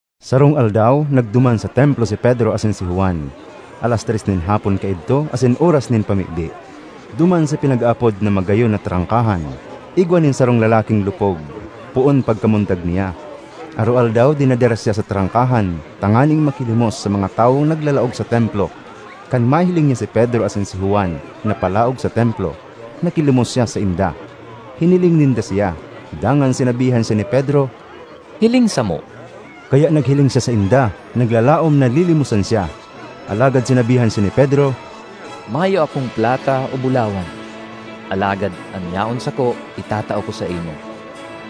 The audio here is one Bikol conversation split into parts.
Sarong aldaw, nagduman sa Templo si Pedro asin si Juan. Alas tres nin hapon kaidto asin oras nin pamibi. Duman sa pinag-aapod na “Magayon na Trangkahan,” igwa nin sarong lalaking lupog poon pagkamundag niya. Aroaldaw dinadara siya sa trangkahan, tanganing makilimos sa mga tawong naglalaog sa Templo. Kan mahiling niya si Pedro asin si Juan na palaog sa Templo, nakilimos siya sainda. Hiniling ninda siya, dangan sinabihan siya ni Pedro, “Hiling samo!” Kaya naghiling siya sainda, naglalaom na lilimosan siya. Alagad sinabihan siya ni Pedro, “Mayo akong plata o bulawan, alagad an yaon sako itatao ko saimo: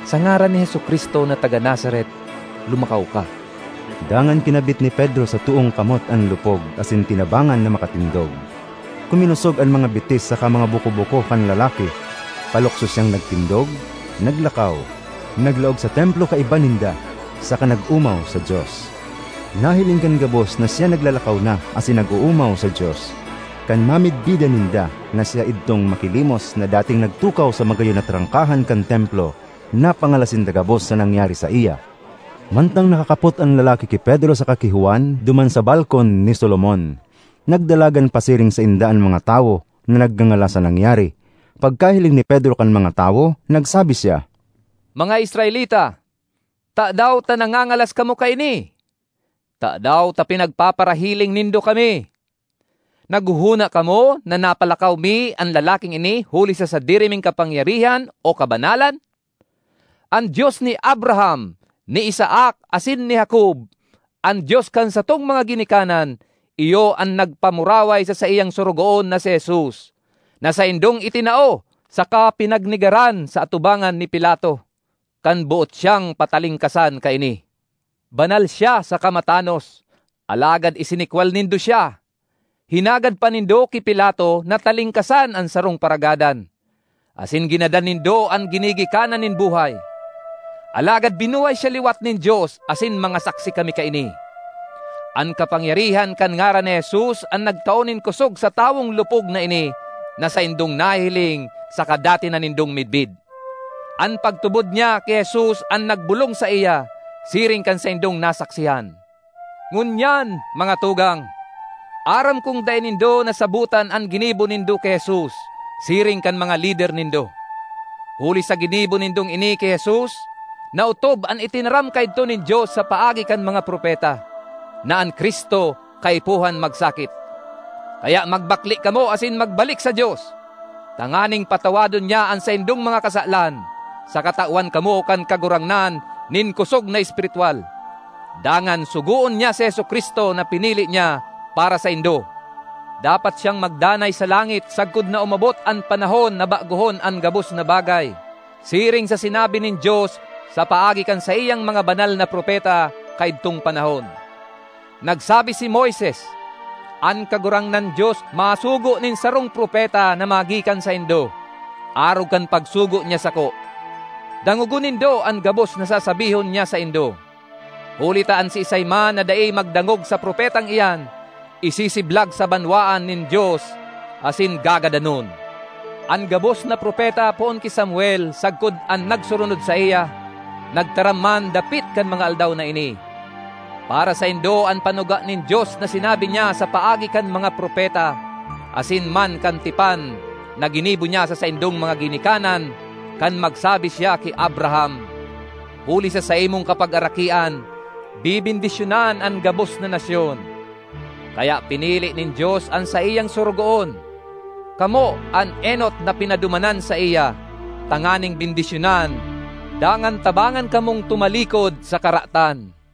sa ngaran ni Jesu-Cristo na taga Nazaret, lumakaw ka!” Dangan kinabit ni Pedro sa toong kamot an lupog asin tinabangan na makatindog. Kuminosog an mga bitis saka mga buko-buko kan lalaki. Palukso siyang nagtindog, naglakaw, naglaog sa Templo kaiba ninda, saka nag-omaw sa Dios. Nahiling kan gabos na siya naglalakaw na asin nag-oomaw sa Dios; kan mamidbidan ninda na siya idtong makilimos na dating nagtukaw sa “Magayon na Trangkahan” kan Templo, napangalas sinda gabos sa nangyari saiya. Mantang nakakapot an lalaki ki Pedro saka ki Juan duman sa “Balkon ni Solomon,” nagdalagan pasiring sainda an mga tawo na nagngangalas sa nangyari. Pagkahiling ni Pedro kan mga tawo, nagsabi siya, “Mga Israelita, tadaw ta nagngangalas kamo kaini? Tadaw ta pinagpaparahiling nindo kami? Naghohona kamo na napalakaw mi an lalaking ini huli sa sadiri ming kapangyarihan o kabanalan? An Dios ni Abraham, ni Isaac asin ni Jacob, an Dios kan satong mga ginikanan iyo an nagpamuraway sa saiyang Sorogoon na si Jesus, na saindong itinao saka pinagnegaran sa atubangan ni Pilato, kan boot siyang patalingkasan kaini. Banal siya saka matanos, alagad isinikwal nindo siya; hinagad pa nindo ki Pilato na talingkasan an sarong paragadan, asin ginadan nindo an Ginigikanan nin buhay. Alagad binuhay siya liwat nin Dios asin mga saksi kami kaini. An kapangyarihan kan ngaran ni Jesus an nagtao nin kosog sa tawong lupog na ini na saindong nahihiling saka dati na nindong midbid. An pagtubod niya ki Jesus an nagbolong saiya, siring kan saindong nasaksihan. ”Ngunyan, mga tugang, aram kong dai nindo nasabotan an ginibo nindo ki Jesus, siring kan mga lider nindo. Huli sa ginibo nindong ini ki Jesus, naotob an itinaram kaidto nin Dios sa paagi kan mga propeta, na an Cristo kaipuhan magsakit. Kaya magbakle kamo asin magbalik sa Dios, tanganing patawadon niya an saindong mga kasalan, saka tawan kamo kan Kagurangnan nin kosog na espiritwal, dangan sugoon niya si Jesu-Cristo na pinili niya para saindo. Dapat siyang magdanay sa langit sagkod na umabot an panahon na bagohon an gabos na bagay, siring sa sinabi nin Dios sa paagi kan saiyang mga banal na propeta kaidtong panahon. Nagsabi si Moises, ‘An Kagurangnan Dios masugo nin sarong propeta na magikan saindo, arog kan pagsugo niya sako. Dangogon nindo an gabos na sasabihon niya saindo. Huli ta an siisay man na dai magdangog sa propetang iyan, isisiblag sa banwaan nin Dios asin gagadanon.’ An gabos na propeta poon ki Samuel sagkod an nagsurunod saiya, nagtaram man dapit kan mga aldaw na ini. Para saindo an panuga nin Dios na sinabi niya sa paagi kan mga propeta, asin man kan tipan na ginibo niya sa saindong mga ginikanan kan magsabi siya ki Abraham, ‘Huli sa saimong kapagarakian, bebendisyonan an gabos na nasyon.’ Kaya pinili nin Dios an saiyang Sorogoon; kamo an enot na pinadumanan saiya, tanganing bendisyonan dangan tabangan kamong tumalikod sa karatan.”